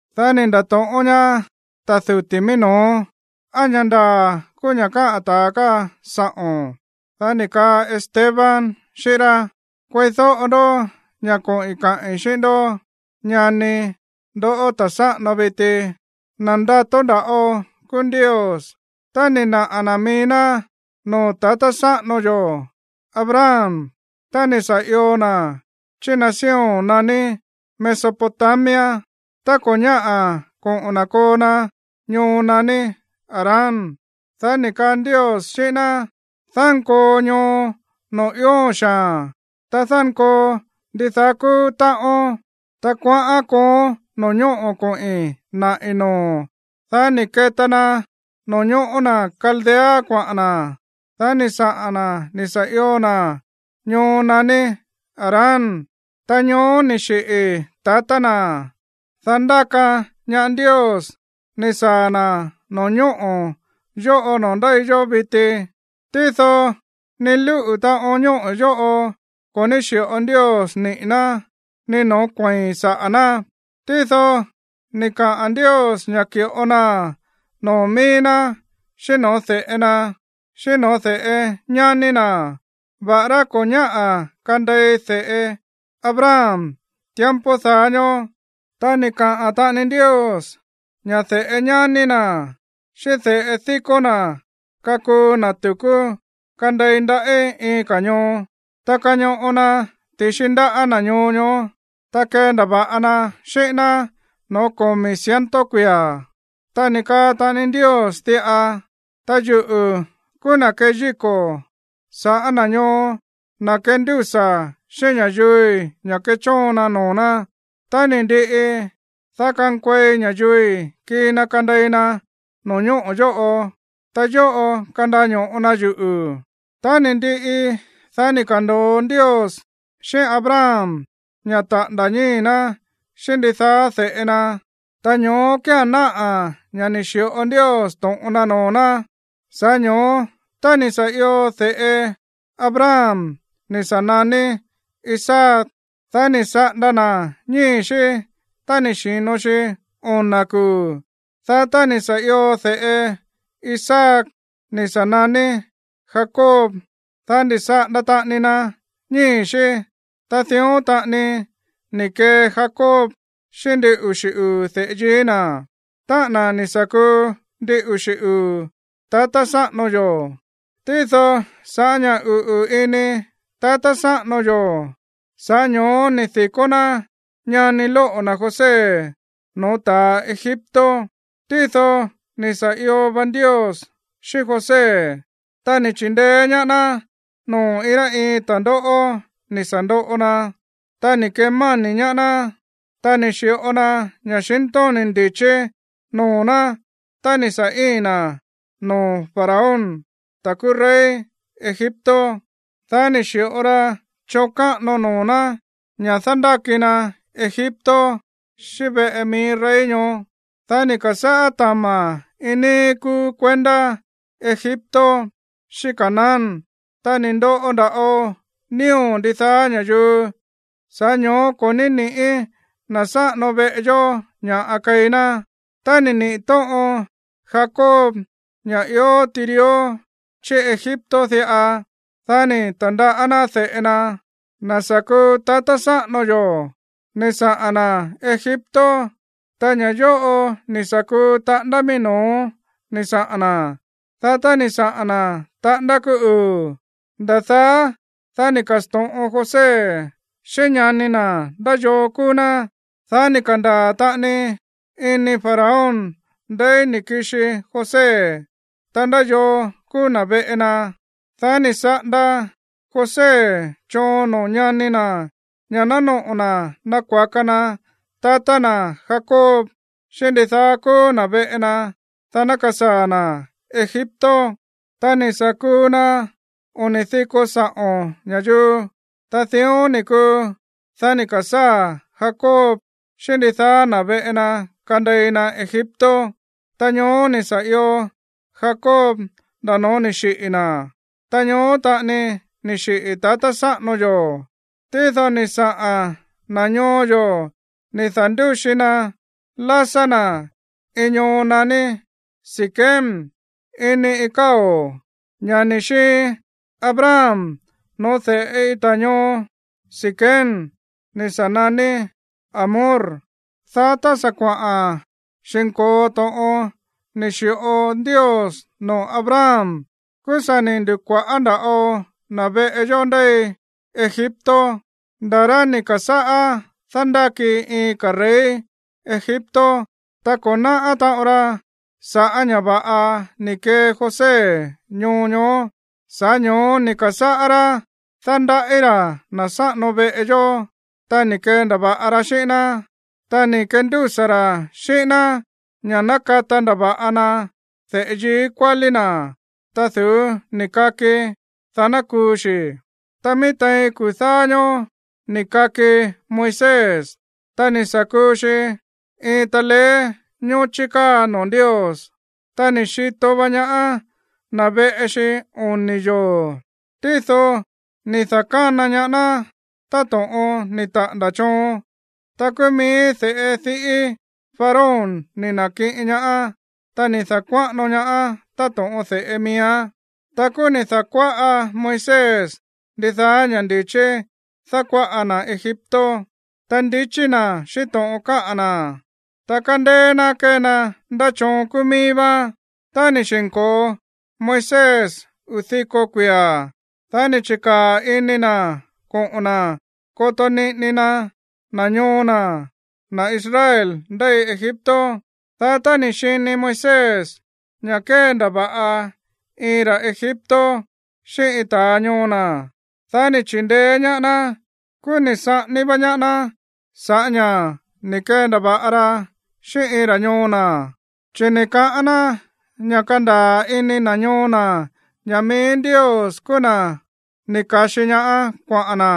Dá ni̱ nda̱to̱ꞌón ñaá ta̱ duti̱ mií no̱ó: ―¿Á ña̱ ndaa̱ kúú ña̱ káꞌa̱n ta̱a káa sa̱ꞌo̱n? Dá ni̱ kaa Esteban xíꞌín rá: ―Kueídóꞌo ndó ña̱ koꞌi̱n kaꞌi̱n xíꞌín ndó, ñani, ndoꞌó, ta̱ sáꞌano viti. Na̱ ndato nda̱ꞌo kúú Ndios, ta ni̱ naꞌa̱ na̱ mií ná noo̱ tatá sáꞌano yo̱ Abraham tá ni̱ sa̱ io na̱ chí nación naní Mesopotamia, tá ko̱ ñáꞌa̱ koꞌo̱n na̱ koo na ñoo naní Harán. Dá ni̱ kaa Ndios xíꞌín ná: “Dánkoo ñoo noo̱ ióo̱n xaa̱n, ta dánkoo ndidaá kúú táꞌón. Ta kuaꞌán kooón no̱ñóꞌo̱ koꞌi̱n naꞌi̱ noo̱o̱n.” ’Dá ni̱ keta na no̱ñóꞌo̱ na̱ Caldea kuaꞌa̱n na̱. Dá ni̱ saꞌa̱n na̱ ni̱ sa̱ io na̱ ñoo naní Harán. Ta ñoó ni̱ xiꞌi̱ tatá na̱. Dá ndáka ñaá Ndios ni̱ saa̱ na̱ no̱ñóꞌo̱ yóꞌo noo̱ ndéi yó viti. Tído ni lúꞌu̱ taꞌon ñóꞌo̱ yóꞌo ko̱ ní xíꞌo Ndios niꞌi̱ ná, ni noo̱ kuei̱n saꞌa̱ ná. Tído ni̱ kaꞌa̱n Ndios ña̱ ki̱ꞌo naa̱n noo̱ mií ná xíꞌín no̱ó de̱ꞌe na, xíꞌín no̱ó de̱ꞌe ñání na̱, va̱ꞌará ko̱ ñáꞌa̱ kandei de̱ꞌe Abraham tiempo daá ñóó. Ta ni̱ kaꞌa̱n taꞌani Ndios ña̱ de̱ꞌe ñání na̱ xíꞌín de̱ꞌe díkó na̱ kakuu na̱ tu̱kú kandei ndaꞌí iin ka̱ ñoo. Ta kañoꞌo na ti̱xi ndáꞌa̱ na̱ ñoo ñoó, ta kendava̱ꞌa na xíꞌín ná noo̱ komi̱ ciento kuia̱. Ta ni̱ kaa taꞌani Ndios diꞌa: “Ta yuꞌu̱ kúú na̱ keyíko̱ sa̱ꞌá na̱ ñoo, na̱ kendúsa̱ xíꞌín ña̱yuui̱ ña̱ kechóon na noo̱ ná. Tá ni̱ ndiꞌi, dá kankuei ña̱yuui̱ kii na kandei na no̱ñóꞌo̱ yóꞌo, ta yóꞌo̱ kandaño̱ꞌo na yuꞌu̱.” ’Tá ni̱ ndiꞌi, dá ni̱ ka̱ndo̱o Ndios xíꞌín Abraham ña̱ taꞌa̱nda̱ ñíi̱ ná xíꞌín ndidaá de̱ꞌe na, ta ñoó kía̱n náꞌa̱ ña̱ ni̱ xi̱ꞌo Ndios to̱ꞌon na noo̱ ná. Sa̱ꞌá ño̱ó, tá ni̱ sa̱ io de̱ꞌe Abraham ni̱ sa̱ naní Isaac, dá ni̱ saꞌanda na̱ ñíi̱ xí tá ni̱ xi̱no xi ona̱ kuu̱. Dá tá ni̱ sa̱ io de̱ꞌe Isaac ni̱ sa̱ naní Jacob, dá ni̱ saꞌanda taꞌani na ñíi̱ xí. Ta dión taꞌani ni̱ kee Jacob xíꞌín ndin uxi̱ uu̱ de̱ꞌe yií na̱, táꞌa̱n na̱ ni̱ sa̱ kuu ndin uxi̱ uu̱ tatá sáꞌano yo̱. ’Tído sa̱ꞌá ña̱ uꞌu̱ ini tatá sáꞌano yo̱, sa̱ꞌá ño̱ó ni̱ di̱kó ná ñani lóꞌo̱ na̱ José no̱ó ta̱a Egipto. Tído ni̱ sa̱ io va Ndios xíꞌín José, ta ni̱ chi̱ndeé ñaá ná noo̱ iin rá iin ta̱ndóꞌó ni̱ sa̱ ndoꞌo na. Ta ni̱ kemáni̱ ñaá ná, ta ni̱ xi̱ꞌo na ña̱xintóni̱ ndi̱chí noo̱ ná tá ni̱ sa̱ íin na noo̱ Faraón, ta̱ kúú rey Egipto. Dá ni̱ xi̱ꞌo ra choon káꞌano noo̱ ná ña̱ dándáki na Egipto, xíꞌín veꞌe mií rey ñoó. ’Dá ni̱ ka̱sáa̱ tama̱ iin níí kúú kuendá Egipto xíꞌín Canaán. Ta ni̱ ndoꞌo nda̱ꞌo nío̱ ndidaá ña̱yuu. Sa̱ꞌá ño̱ó ko̱ ní ni̱ꞌí na̱ sáꞌano veꞌe yó ña̱ keí ná. Tá ni̱ niꞌi̱ tóꞌon Jacob ña̱ ió tirió chí Egipto diꞌa, dá ni̱ ta̱ndaꞌá ná de̱ꞌe na, na̱ sa̱ kuu tatá sáꞌano yo̱, ni̱ saꞌa̱n na̱ Egipto. Ta ña̱ yóꞌo ni̱ sa̱ kuu taꞌándá mií no̱ó ni̱ saꞌa̱n na̱. Dá tá ni̱ saꞌa̱n na̱ taꞌándá kúú uu̱, nda̱ daá, dá ni̱ ka̱sto̱ꞌon José xíꞌín ñani na̱ ndá yoo kúú ná. Dá ni̱ ka̱ndaa̱ taꞌani ini Faraón ndeí ni̱ kixi José, ta ndá yoo kúú na̱ veꞌe na. Dá ni̱ saꞌanda José choon noo̱ ñani na̱ ña̱ ná noꞌo̱ na̱ nakuaka na tatá na̱ Jacob xíꞌín ndidaá kúú na̱ veꞌe na, dá ná kasaa̱ na̱ Egipto. Ta ni̱ sa̱ kúú ná oni̱ diko saꞌo̱n ña̱yuu. ’Ta dión ni̱ kuu. Dá ni̱ ka̱sáa̱ Jacob xíꞌín ndidaá na̱ veꞌe na kandei na Egipto. Ta ñoó ni̱ sa̱ io Jacob nda̱ no̱ó ni̱ xiꞌi̱ na̱. Ta ñoó taꞌani ni̱ xiꞌi̱ tatá sáꞌano yo̱. Tído ni̱ saꞌa̱n na̱ ñoo yo̱ ni̱ da̱ndúxi na lásá na̱ iin ñoo naní Siquem ini iin káo̱, ña̱ ni̱ xiin Abraham no̱ó de̱ꞌe iin ta̱ ñoo Siquem ni̱ sa̱ naní Hamor. ’Dá tá sa̱ kuaꞌa̱n xi̱nko̱o to̱ꞌon ni̱ xi̱ꞌo Ndios noo̱ Abraham, kúú sa̱ ni̱ ndu̱kua̱ꞌá nda̱ꞌo na̱ veꞌe yó ndéi Egipto, nda̱ rá ni̱ ka̱sáꞌá dándáki iin ka̱ rey Egipto. Ta ko̱ náꞌá taꞌon ra sa̱ꞌá ña̱ va̱ꞌa ni̱ kee José ñoo ñoó. Sa̱ꞌá ño̱ó ni̱ ka̱sáꞌá rá dándaꞌí ra̱ na̱ sáꞌano veꞌe yó, ta ni̱ kendava̱ꞌa ra xíꞌín ná, ta ni̱ kendúsa̱ ra̱ xíꞌín ná ña̱ ná kata ndava̱ꞌa na de̱ꞌe yií kuálí ná, ta du̱ú ni̱ kaki, dá ná kuu xi̱. ’Ta mií tein kuu̱ dáá ñóó ni̱ kaki Moisés. Ta ni̱ sa̱ kuu xi iin taleé ñóchí káa noo̱ Ndios. Ta ni̱ xito va ñaá na̱ veꞌe xi oni̱ yoo̱. Tído ni̱ da̱kána ñaá ná táto̱ꞌon ni̱ taꞌa̱nda̱ choon. Ta kúú mií de̱ꞌe diꞌí Faraón ni̱ na̱kiꞌin ñaá. Ta ni̱ da̱kuáꞌano ñaáán táto̱ꞌon de̱ꞌe miíán. Ta kúú ni̱ da̱kuáꞌa Moisés ndidaá ña̱ ndi̱chí dákuáꞌa na̱ Egipto. Ta ndichí na̱ xíꞌín to̱ꞌon káꞌa̱n na̱, ta kándéé ná kée na ndá choon kúú mií vá. ’Tá ni̱ xi̱nko̱o Moisés uu̱ diko kuia̱, dá ni̱ chi̱kaa̱ ini na̱ koꞌo̱n na̱ koto niꞌini na na̱ ñoo na̱, na̱ Israel ndéi Egipto. Dá tá ni̱ xini Moisés ña̱ kéndava̱ꞌa iin ra̱ Egipto xíꞌín iin ta̱ ñoo na̱, dá ni̱ chi̱ndeé ñaá ná. Kúú ni̱ saꞌání vá ñaá ná sa̱ꞌá ña̱ ni̱ kendava̱ꞌa ra xíꞌín iin ra̱ ñoo na̱. Chi̱ ni̱ kaꞌán ná ña̱ kandaa̱ ini na̱ ñoo na̱ ña̱ mií Ndios kúú na̱ ni̱ ka̱xi ñaá kuaꞌa̱n na̱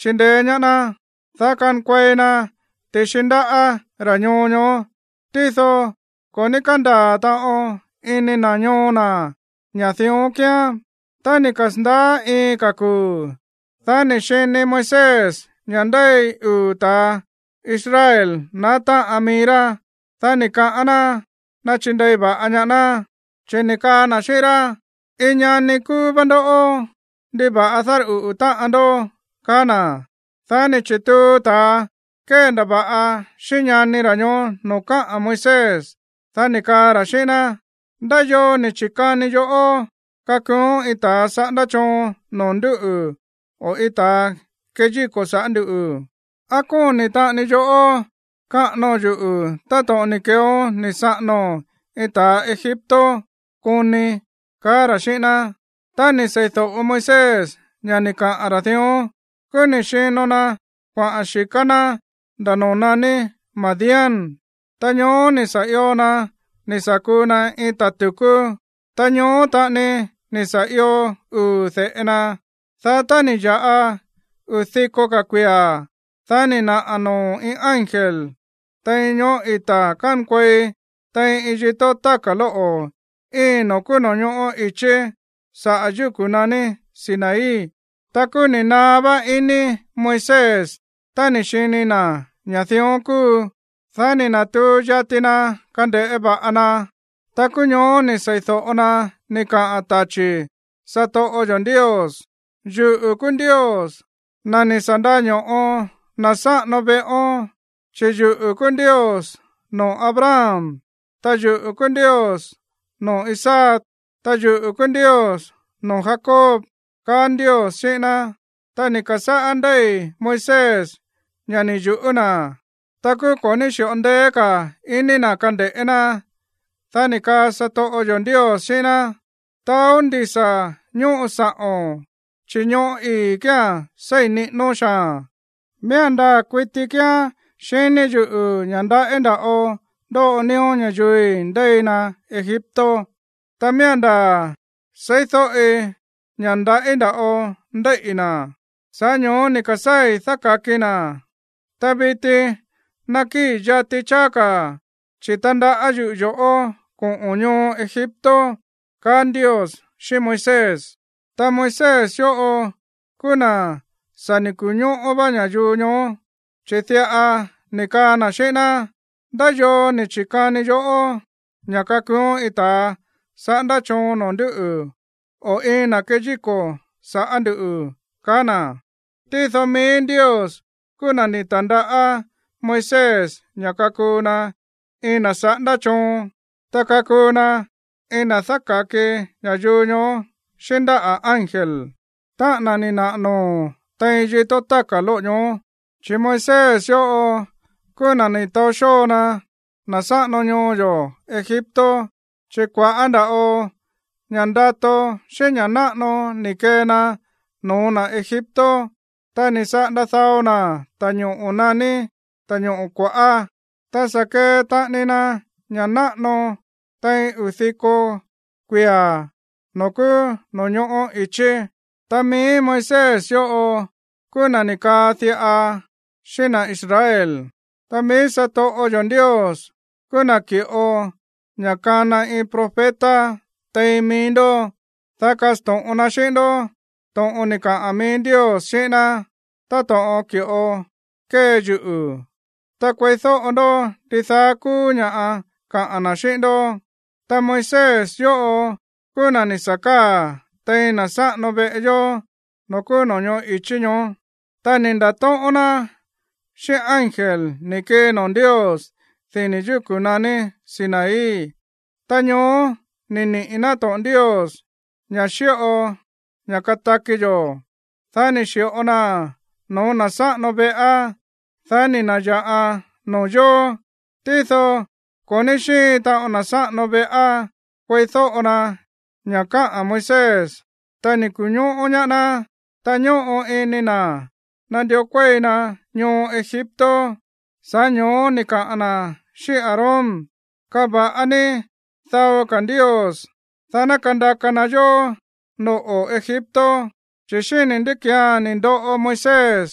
chindeé ñaá ná, dá kankuei na ti̱xi ndáꞌa̱ ra̱ ñoo ñoó. Tído ko̱ ní kándaa̱ taꞌon ini na̱ ñoo na̱ ña̱ dión kíán. ’Tá ni̱ kasa̱ndaá iin ka̱ kuu̱, dá ni̱ xini Moisés ña̱ ndéi uu̱ ta̱a Israel naá táꞌan mií rá. Dá ni̱ kaꞌán ná nachindei va̱ꞌa ñaá ná, chi̱ ni̱ kaa na̱ xíꞌín rá: “Iin ñani kúú vá ndoꞌó. ¿Ndiva̱ꞌa dárꞌuꞌu̱ táꞌan ndó?”, kaá na̱. Dá ni̱ chi̱tuu ta̱a kéndava̱ꞌa xíꞌín ñani ra̱ ñoó noo̱ káꞌa̱n Moisés. Dá ni̱ kaa ra̱ xíꞌín ná: “¿Ndá yoo ni̱ chi̱kani yoꞌó kakuuón iin ta̱ saꞌándá choon noo̱ ndúꞌu̱ o iin ta̱a kéyíko̱ sa̱ꞌá nduꞌu̱? ¿Á kóni̱ taꞌani yoꞌó kaꞌánóo̱n yuꞌu̱ táto̱ꞌon ni̱ keeón ni̱ saꞌánóo̱n iin ta̱ Egipto koni?”, kaá ra̱ xíꞌín ná. Tá ni̱ sei̱do̱ꞌo Moisés ña̱ ni̱ kaꞌa̱n ra̱ dión, kúú ni̱ xino na kuaꞌa̱n xi̱ká ná nda̱ noo̱ naní Madián. Ta ñoó ni̱ sa̱ io na̱ ni̱ sa̱ kuu na iin ta̱ tu̱kú. Ta ñoó taꞌani ni̱ sa̱ io uu̱ de̱ꞌe na. ’Dá tá ni̱ ya̱ꞌa uu̱ diko ka̱ kuia̱, dá ni̱ naꞌa̱ noo̱ iin ángel tein ñoꞌó ita̱ kánkuei tein iin yitó táka̱ lóꞌo̱ íin noo̱ kúú no̱ñoꞌó i̱chí saꞌa̱ yúku̱ naní Sinaí. Ta kúú ni̱ naá vá ini Moisés tá ni̱ xini na̱ ña̱ dión kúu. Dá ni̱ na̱tuu yati na kande̱ꞌé va̱ꞌa na. Ta kúú ñoó ni̱ sei̱do̱ꞌo na ni̱ kaꞌa̱n tachi̱ satoꞌo yo̱ Ndios: “Yuꞌu̱ kúú Ndios, na̱ ni̱ sa̱ ndaño̱ꞌo na̱ sáꞌano veꞌón, chi̱ yuꞌu̱ kúú Ndios noo̱ Abraham, ta yuꞌu̱ kúú Ndios noo̱ Isaac, ta yuꞌu̱ kúú Ndios noo̱ Jacob”, kaá Ndios xíꞌín ná. Ta ni̱ ka̱sáꞌá ndéi̱ Moisés ña̱ ni̱ yu̱ꞌú na̱. Ta kúú ko̱ ní xi̱ꞌo ndeé ka̱ iní na̱ kande̱ꞌé ná. Dá ni̱ kaa satoꞌo yo̱ Ndios xíꞌín ná: “Taó ndisa̱ ñóꞌo sa̱ꞌo̱n, chi̱ ñóꞌo̱ ii̱ kíán séi̱n niꞌínón xaa̱n. Miía̱n ndaa̱ kuiti kíán xiní yuꞌu̱ ña̱ ndaꞌí nda̱ꞌo ndóꞌo nío̱ ña̱yuui̱ ndéi na Egipto. Ta miía̱n ndaa̱ seídóꞌi ña̱ ndaꞌí nda̱ꞌo ndéíꞌi̱ na̱. Sa̱ꞌá ño̱ó ni̱ ka̱sáa̱i̱ dáka̱kii na̱. Ta viti nakíi̱ yati cháá ka̱, chi̱ tandaꞌá yuꞌu̱ yo̱ꞌó koꞌo̱n ñoo Egipto”, kaá Ndios xíꞌín Moisés. ’Ta Moisés yóꞌo kúú na̱ sa̱ ni̱ ku̱ñóꞌó vá ña̱yuu ñoó, chi̱ diꞌa ni̱ kaa na̱ xíꞌín ná: “¿Ndá yoo ni̱ chi̱kani yoꞌó ña̱ kakuuón iin ta̱ saꞌándá choon noo̱ ndúꞌu̱ o iin na̱ kéyíko̱ sa̱ꞌá nduꞌu̱?”, kaá na̱. Tído mií Ndios kúú na̱ ni̱ ta̱ndaꞌá Moisés ña̱ kakuu na iin na̱ saꞌándá choon, ta kakuu na iin na̱ dáka̱ki ña̱yuu ñoó xíꞌín ndáꞌa̱ ángel, táꞌa̱n na̱ ni̱ naꞌa̱ noo̱ tein yitó táka̱ lóꞌo̱ ñoó. ’Chi̱ Moisés yóꞌo kúú na̱ ni̱ taó xóo na̱ sáꞌano ñoo yo̱ Egipto, chi̱ kua̱ꞌá nda̱ꞌo ña̱ ndato xíꞌín ña̱ náꞌano ni̱ kee na no̱ó na̱ Egipto. Ta ni̱ saꞌanda dao na̱ ta̱ñoꞌo̱ naní Ta̱ñoꞌo̱ Kua̱ꞌá. Ta sa̱ kee taꞌani na ña̱ náꞌano tein uu̱ diko kuia̱ noo̱ kúú no̱ñoꞌó i̱chí. Ta mií Moisés yóꞌo kúú na̱ ni̱ kaꞌa̱n diꞌa xíꞌín na̱ Israel: “Ta mií satoꞌo yo̱ Ndios kúú na̱ ki̱ꞌo ña̱ kana iin profeta tein mií ndó, dá kasto̱ꞌon ná xíꞌín ndó to̱ꞌon ni̱ kaꞌa̱n mií Ndios xíꞌín ná, táto̱ꞌon ki̱ꞌo kée yuꞌu̱. Ta kueídóꞌo ndó ndidaá kúú ña̱ kaꞌa̱n na̱ xíꞌín ndó.” Tá Moisés yóꞌo kúú na̱ ni̱ sa̱ káa̱ tein na̱ sáꞌano veꞌe yó noo̱ kúú no̱ñoꞌó i̱chí ñoó, ta ni̱ nda̱tóꞌón ná xíꞌín ángel ni̱ kii noo̱ Ndios dini̱ yúku̱ naní Sinaí. Ta ñoó ni̱ niꞌi̱ ná to̱ꞌon Ndios, ña̱ xíꞌo ña̱ kataki yo̱. Dá ni̱ xi̱ꞌo naa̱n no̱ó na̱ sáꞌano veꞌá, dá ni̱ na̱ya̱ꞌan noo̱ yóó. ’Tído ko̱ ní xíin taꞌon na̱ sáꞌano veꞌá kueídóꞌo na ña̱ káꞌa̱n Moisés, ta ni̱ ku̱ñóꞌó ñaá ná. Ta ñóꞌo ini na̱ nandió kuéi na ñoo Egipto. Sa̱ꞌá ño̱ó ni̱ kaa na̱ xíꞌín Aarón: “Kava̱ꞌa ní dao ka̱ ndios, dá ná kandaka na yó noꞌo̱ Egipto, chi̱ xíni̱ ndí ki̱án ni̱ ndoꞌo Moisés,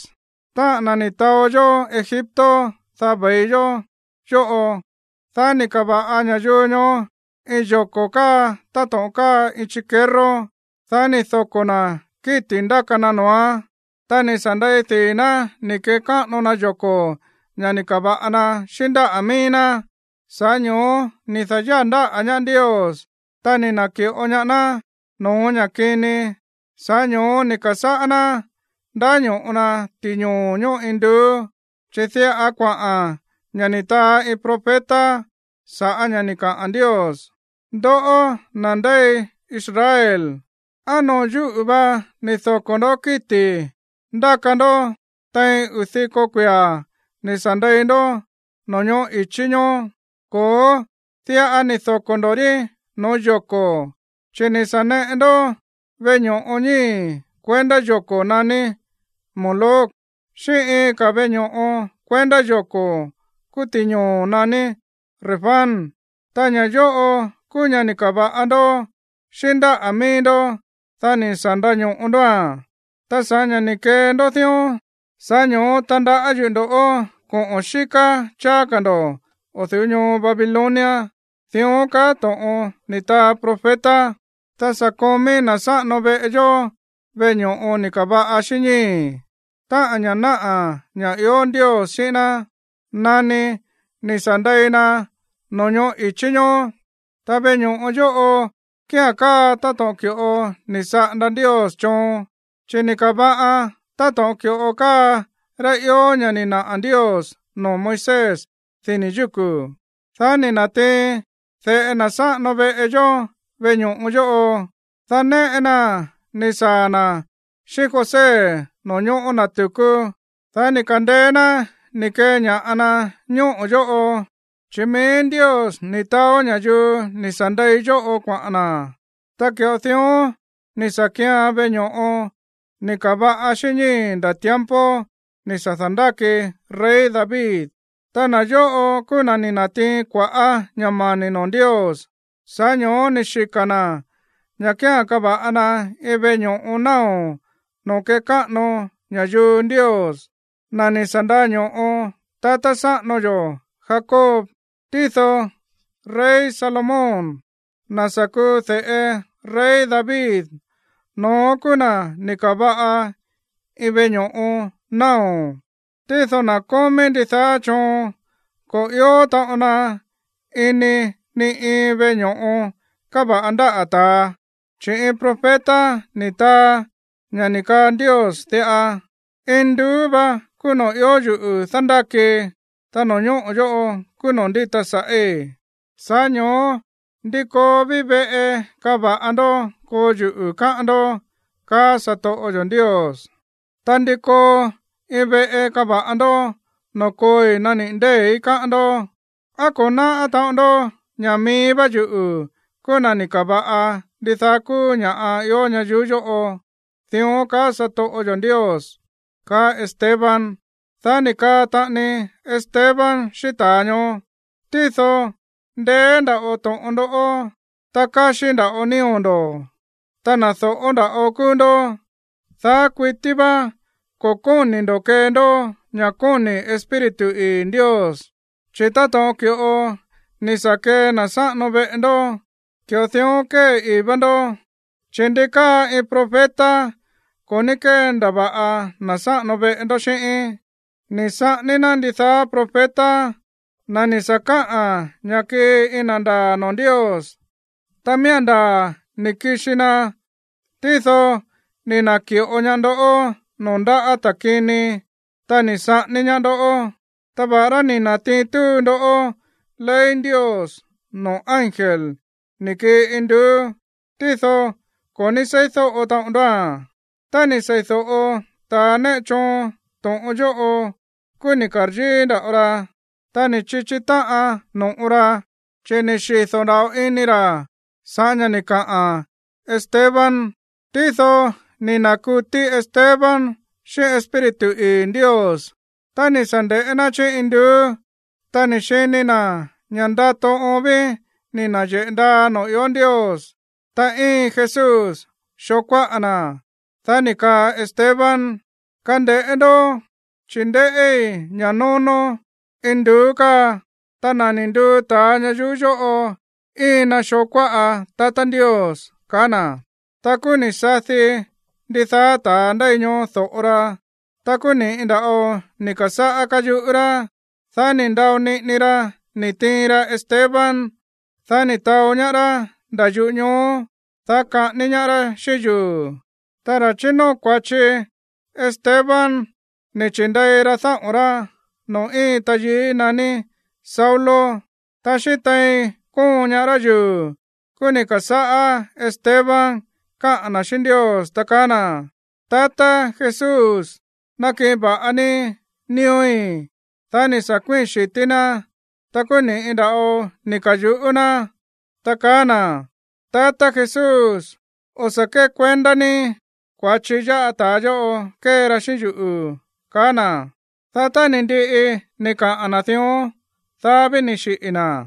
táꞌa̱n na̱ ni̱ taó yó Egipto, dá ve̱i yó yóꞌo.” Dá ni̱ ka̱va̱ꞌa ña̱yuu ñoó iin yoko̱ káa táto̱ꞌon káa iin chikerró. Dá ni̱ doko̱ ná kíti̱ ndáka na noo̱án, ta ni̱ sa̱ ndei dii̱ ná ni̱ kekáꞌano na yoko̱, ña̱ ni̱ ka̱va̱ꞌa na xíꞌín ndáꞌa̱ mií ná. ’Sa̱ꞌá ño̱ó ni̱ da̱yáa̱ ndáꞌa̱ ñaá Ndios, ta ni̱ na̱ki̱ꞌo ñaá ná no̱ó ña̱ kini. Sa̱ꞌá ño̱ó ni̱ ka̱sáꞌá ná ndáño̱ꞌo na ti̱ñoo̱ ñóꞌo induú, chi̱ diꞌa kuaꞌa̱n ña̱ ni̱ taa iin profeta sa̱ꞌá ña̱ ni̱ kaꞌa̱n Ndios: Ndoꞌó, na̱ ndéi Israel, ¿á noo̱ yúꞌu̱ va ni̱ doko̱ ndoꞌó kíti̱ ndáka ndó tein uu̱ diko kuia̱ ni̱ sa̱ ndei ndó no̱ñoꞌó i̱chí ñoó? Ko̱ó, diꞌa ni̱ doko̱ ndo̱ rí no̱ó yoko̱, chi̱ ni̱ sa̱ neꞌe ndó veꞌe ño̱ꞌo ñíi̱ kuendá yoko̱ naní Moloc xíꞌín iin ka̱ veꞌe ño̱ꞌo kuendá yoko̱ kúú ti̱ñoo̱ naní Refán. Ta ña̱ yóꞌo kúú ña̱ ni̱ ka̱va̱ꞌa ndó xíꞌín ndáꞌa̱ mií ndó, dá ni̱ sa̱ ndaño̱ꞌo ndóa̱n. Ta sa̱ꞌá ña̱ ni̱ kee ndó dión, sa̱ꞌá ño̱ó tandaꞌá yuꞌu̱ ndo̱ꞌó koꞌo̱n xíká cháá ka̱ ndo̱ o̱ du̱ú ñoo Babilonia. Dión kaá to̱ꞌon ni̱ taa profeta. ’Ta sa̱ komí na̱ sáꞌano veꞌe yó veꞌe ño̱ꞌo ni̱ ka̱va̱ꞌa xíꞌín ñíi̱, táꞌa̱n ña̱ náꞌa̱ ña̱ ió Ndios xíꞌín ná, nani ni̱ sa̱ ndei na no̱ñoꞌó i̱chí ñoó. Ta veꞌe ño̱ꞌo yóꞌo kía̱n káa táto̱ꞌon ki̱ꞌo ni̱ saꞌanda Ndios choon, chi̱ ni̱ ka̱va̱ꞌan táto̱ꞌon ki̱ꞌo káa rá ió ña̱ ni̱ naꞌa̱ Ndios noo̱ Moisés dini̱ yúku̱. Dá ni̱ na̱tiin de̱ꞌe na̱ sáꞌano veꞌe yó veꞌe ño̱ꞌo yóꞌo. Ta néꞌe naa̱n ni̱ saa̱ na̱ xíꞌín José no̱ñóꞌo̱ na̱ tu̱kú. Dá ni̱ ka̱ndeé ná ni̱ keña̱ꞌa na ñóꞌo̱ yóꞌo, chi̱ mií Ndios ni̱ taó ña̱yuu ni̱ sa̱ ndei yóꞌo kuaꞌa̱n na̱. Ta ki̱ꞌo dión ni̱ sa̱ kíán veꞌe ño̱ꞌo ni̱ ka̱va̱ꞌa xíꞌín ñíi̱ nda̱ tiempo ni̱ sa̱ da̱ndáki rey David. ’Ta na̱ yóꞌo kúú na̱ ni̱ na̱tiin kua̱ꞌá ña̱ mani̱ noo̱ Ndios, sa̱ꞌá ño̱ó ni̱ xika̱ na̱ ña̱ kía̱n kava̱ꞌa na iin veꞌe ño̱ꞌo náo̱ noo̱ kekáꞌano ña̱yuu Ndios, na̱ ni̱ sa̱ ndaño̱ꞌo tatá sáꞌano yo̱ Jacob. Tído rey Salomón, na̱ sa̱ kuu de̱ꞌe rey David, no̱ón kúú na̱ ni̱ ka̱va̱ꞌa iin veꞌe ño̱ꞌo náo̱. Tído na̱ kómí ndidaá choon ko̱ ió taꞌon na ini ni iin veꞌe ño̱ꞌo ni̱ ka̱va̱ꞌa ndáꞌa̱ ta̱a, chi̱ iin profeta ni̱ taa ña̱ ni̱ kaa Ndios diꞌa: Induú va kúú noo̱ ió yuꞌu̱ dándákii, ta no̱ñóꞌo̱ yóꞌo kúú noo̱ ndíta sa̱ꞌí. Sa̱ꞌá ño̱ó, ¿ndi koo ví veꞌe kava̱ꞌa ndó koo yuꞌu̱, káꞌán ndó?, kaá satoꞌo yo̱ Ndios. Ta, ¿ndi koo iin veꞌe kava̱ꞌa ndó noo̱ kooi nániꞌi̱ ndée̱í, káꞌán ndó? ¿Á ko̱ náꞌá taꞌon ndó ña̱ mií vá yuꞌu̱ kúú na̱ ni̱ ka̱va̱ꞌa ndidaá kúú ña̱ꞌa ió ñayuú yóꞌo? Dión kaá satoꞌo yo̱ Ndios ―kaá Esteban. Dá ni̱ kaa taꞌani Esteban xíꞌín ta̱a ñoó: ―Tído ndeé nda̱ꞌo to̱ꞌon ndó, ta káxí nda̱ꞌo nío̱ ndo̱, ta na̱ dóꞌó nda̱ꞌo kúú ndó. Daá kuití vá ko̱ kóni̱ ndo̱ kee ndó ña̱ kóni̱ Espíritu ii̱ Ndios, chi̱ táto̱ꞌon ki̱ꞌo ni̱ sa̱ kee na̱ sáꞌano veꞌe ndó, ki̱ꞌo dión kée ii̱ vá ndó. Chi̱, ¿ndi káa iin profeta ko̱ ní kéndava̱ꞌa na̱ sáꞌano veꞌe ndó xíꞌín? Ni̱ saꞌání ná ndidaá profeta, na̱ ni̱ sa̱ kaꞌa̱n ña̱ kii iin na̱ ndaa̱ noo̱ Ndios. Ta miía̱n ndaa̱ ni̱ kixi na, tído ni̱ na̱ki̱ꞌo ñaá ndó noo̱ ndáꞌa̱ ta̱ kini, ta ni̱ saꞌání ñaá ndó. Ta va̱ꞌará ni̱ na̱tiin túu ndó ley Ndios noo̱ ángel ni̱ kii induú, tído ko̱ ní seídóꞌo taꞌon ndóa̱n. Tá ni̱ sei̱do̱ꞌo ta̱a néꞌe choon to̱ꞌon yóꞌo, kúú ni̱ ka̱ryíí nda̱ꞌo ra, ta ni̱ chichi táꞌan no̱ꞌo ra, chi̱ ni̱ xido̱ nda̱ꞌo ini ra̱ sa̱ꞌá ña̱ ni̱ kaꞌa̱n Esteban. Tído ni̱ na̱kutí Esteban xíꞌín Espíritu ii̱ Ndios. Ta ni̱ sa̱ nde̱ꞌé ná chí induú. Ta ni̱ xini na̱ ña̱ ndato oon ví náyeꞌe̱ ndaa noo̱ ió Ndios, ta íin Jesús xoo kuáꞌa na̱. Dá ni̱ kaa Esteban: ―Kande̱ꞌé ndó, chi̱ ndéꞌí ña̱ nónó induú káa. Ta na̱ ni̱ nduu ta̱a ñayuú yóꞌo íin na xoo kuáꞌa tatá Ndios ―kaá na̱. Ta kúú ni̱ sadi ndidaá ta̱a ndéi ñoó do̱ꞌo ra. Ta kúú ni̱ꞌi nda̱ꞌo ni̱ ka̱sáꞌá káyuꞌú rá. Dá ni̱ ndao niꞌini ra ni̱ tiin ra Esteban. Dá ni̱ taó ñaá rá nda̱ yuꞌú ñoo, dá kaꞌání ñaá rá xíꞌín yuu̱. Ta ra̱ chínóo kua̱chi Esteban ni̱ chi̱ndei ra dáꞌo̱n rá noo̱ íin tayií naní Saulo. Ta xíꞌín tein kóon ñaá rá yuu̱, kúú ni̱ ka̱sáꞌá Esteban káꞌa̱n na̱ xíꞌín Ndios, ta kaá na̱: ―Tatá Jesús, nakiꞌin va̱ꞌa ní nío̱í. Dá ni̱ sa̱ kuíi̱n xi̱tí ná. Ta kúú ni̱ꞌi nda̱ꞌo ni̱ ka̱yuꞌú ná, ta kaá na̱: ―Tatá Jesús, o̱ sa̱ kékuendá ní kua̱chi yáꞌa ta̱a yóꞌo kée ra xíꞌín yuꞌu̱ ―kaá na̱. Dá tá ni̱ ndiꞌi ni̱ kaꞌa̱n na̱ dión, dá ví ni̱ xiꞌi̱ na̱.